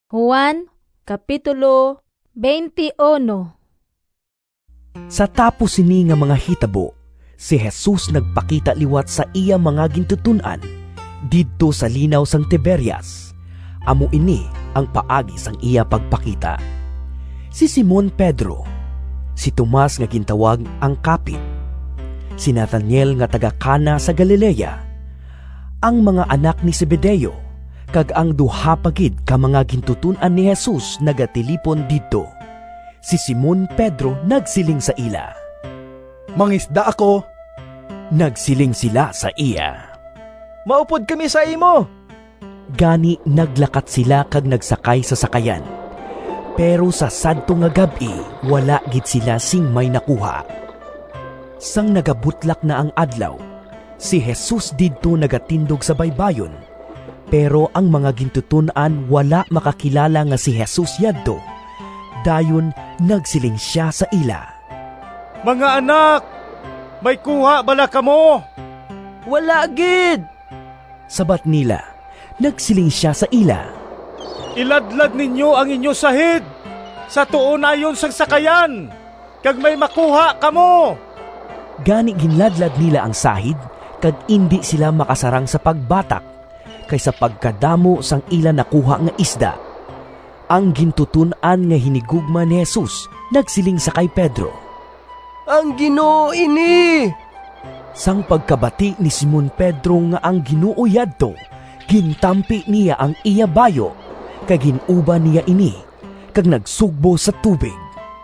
50man lang ka dupa. Sa tapos sini nga mga hitabo si Jesus nagpakita liwat sa iya mga gintuton-an didto sa Linaw sang Tiberias. Amo ini ang paagi sang iya pagpakita. Si Simon Pedro, si Tomas nga gintawag ang Kapid, si Natanael nga taga-Cana sa Galilea, ang mga anak ni Zebedeo, kag ang duha pa gid ka mga gintuton-an ni Jesus nagatilipon didto. Si Simon Pedro nagsiling sa ila, “Mangisda ako.” Nagsiling sila sa iya, “Maupod kami sa imo.” Gani naglakat sila kag nagsakay sa sakayan, pero sa sadto nga gab-i wala gid sila sing may nakuha. Sang nagabutlak na ang adlaw, si Jesus didto nagatindog sa baybayon, pero ang mga gintuton-an wala makakilala nga si Jesus yadto. Dayon nagsiling sia sa ila, “Mga anak, may kuha bala kamo?” “Wala gid,” sabat nila. Nagsiling sia sa ila, “Iladlad ninyo ang inyo sahid sa tuo nayon sang sakayan, kag may makuha kamo.” Gani ginladlad nila ang sahid kag indi sila makasarang sa pagbatak, kay sa pagkadamo sang ila nakuha nga isda. Ang gintuton-an nga hinigugma ni Jesus nagsiling sa kay Pedro, “Ang Ginoo ini!” Sang pagkabati ni Simon Pedro nga ang Ginoo yadto, gintampi niya ang iya bayu (kay gin-uba niya ini) kag nagsugbo sa tubig.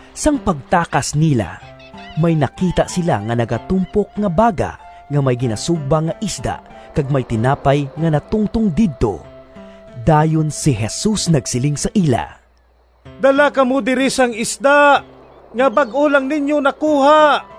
Sang pagtakas nila, may nakita sila nga nagatumpok nga baga nga may ginasugba nga isda kag may tinapay nga natungtong didto. Dayon si Jesus nagsiling sa ila, “Dala kamo diri sang isda nga bag-o lang ninyo nakuha.”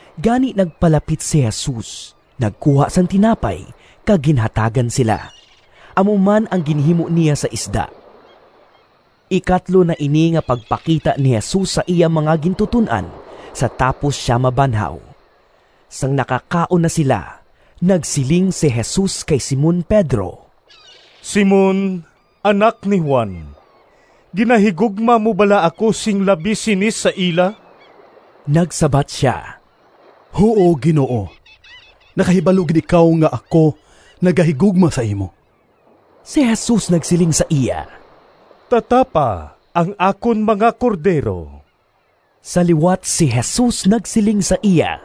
Gani nagpalapit si Jesus, nagkuha sang tinapay, kag ginhatagan sila. Amo man ang ginhimo niya sa isda. Ikatlo na ini nga pagpakita ni Jesus sa iya mga gintuton-an sa tapos sia mabanhaw. Sang nakakaon na sila, nagsiling si Jesus kay Simon Pedro, “Simon, anak ni Juan, ginahigugma mo bala ako sing labi sini sa ila?” Nagsabat sia, “Huo, Ginoo, nakahibalo gid ikaw nga ako nagahigugma sa imo.” Si Jesus nagsiling sa iya, “Tatapa ang akon mga cordero.” Sa liwat si Jesus nagsiling sa iya,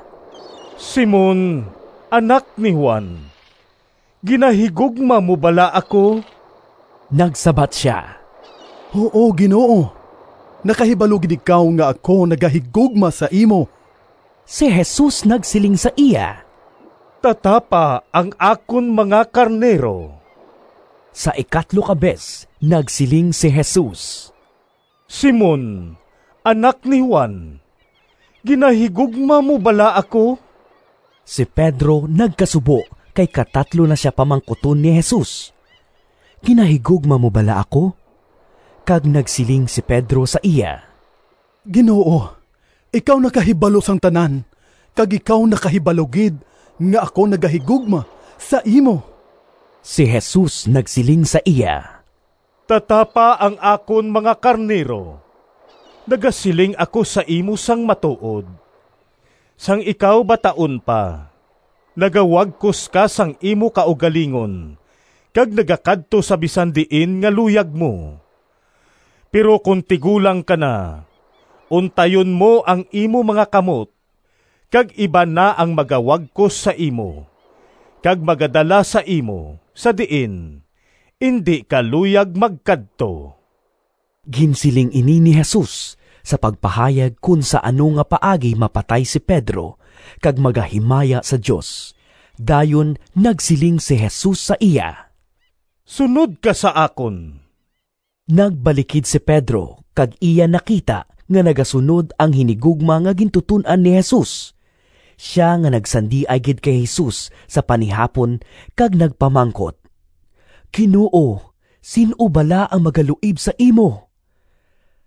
“Simon, anak ni Juan, ginahigugma mo bala ako?” Nagsabat sia, “Huo, Ginoo, nakahibalo gid ikaw nga ako nagahigugma sa imo.” Si Jesus nagsiling sa iya, “Tatapa ang akon mga karnero.” Sa ikatlo ka bes nagsiling si Jesus, “Simon, anak ni Juan, ginahigugma mo bala ako?” Si Pedro nagkasubo kay katatlo na sia pamangkuton ni Jesus, “Ginahigugma mo bala ako?” Kag nagsiling si Pedro sa iya, “Ginoo, ikaw nakahibalo sang tanan, kag ikaw nakahibalo gid nga ako nagahigugma sa imo!” Si Jesus nagsiling sa iya, “Tatapa ang akon mga karnero. Nagasiling ako sa imo sang matuod: sang ikaw bataon pa, nagawagkos ka sang imo kaugalingon kag nagakadto sa bisan diin nga luyag mo; pero kon tigulang ka na, untayon mo ang imo mga kamot, kag iban na ang magawagkos sa imo kag magadala sa imo sa diin indi ka luyag magkadto.” (Ginsiling ini ni Jesus sa pagpahayag kon sa ano nga paagi mapatay si Pedro, kag magahimaya sa Dios.) Dayon nagsiling si Jesus sa iya, “Sunod ka sa akon!” Nagbalikid si Pedro kag iya nakita nga nagasunod ang hinigugma nga gintuton-an ni Jesus, sia nga nagsandiay gid kay Jesus sa panihapon kag nagpamangkot, “Ginoo, sin-o bala ang magaluib sa imo?”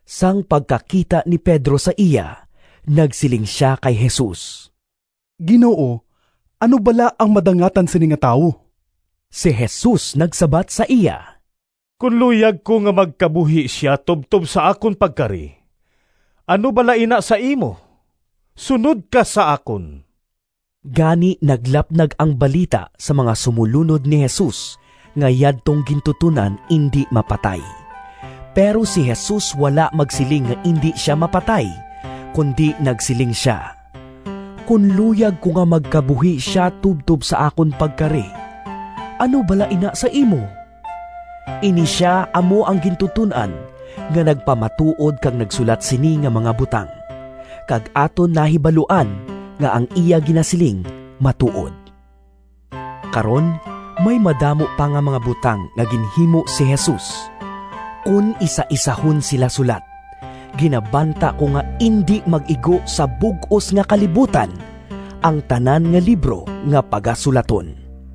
Sang pagkakita ni Pedro sa iya, nagsiling sia kay Jesus, “Ginoo, ano bala ang madangatan sini nga tawo?” Si Jesus nagsabat sa iya, “Kon luyag ko nga magkabuhi sia tubtob sa akon pagkari, ano bala ina sa imo? Sunod ka sa akon!” Gani naglapnag ang balita sa mga sumolunod ni Jesus nga yadtong gintuton-an indi mapatay. Pero si Jesus wala magsiling nga indi sia mapatay, kundi nagsiling sia, “Kon luyag ko nga magkabuhi sia tubtob sa akon pagkari, ano bala ina sa imo?” Ini sia amo ang gintuton-an nga nagpamatuod kag nagsulat sini nga mga butang, kag aton nahibaluan nga ang iya ginasiling matuod. Karon, may madamo pa nga mga butang nga ginhimo si Jesus. Kon isaisahon sila sulat, ginabanta ko nga indi mag-igo sa bug-os nga kalibutan ang tanan nga libro nga pagasulaton.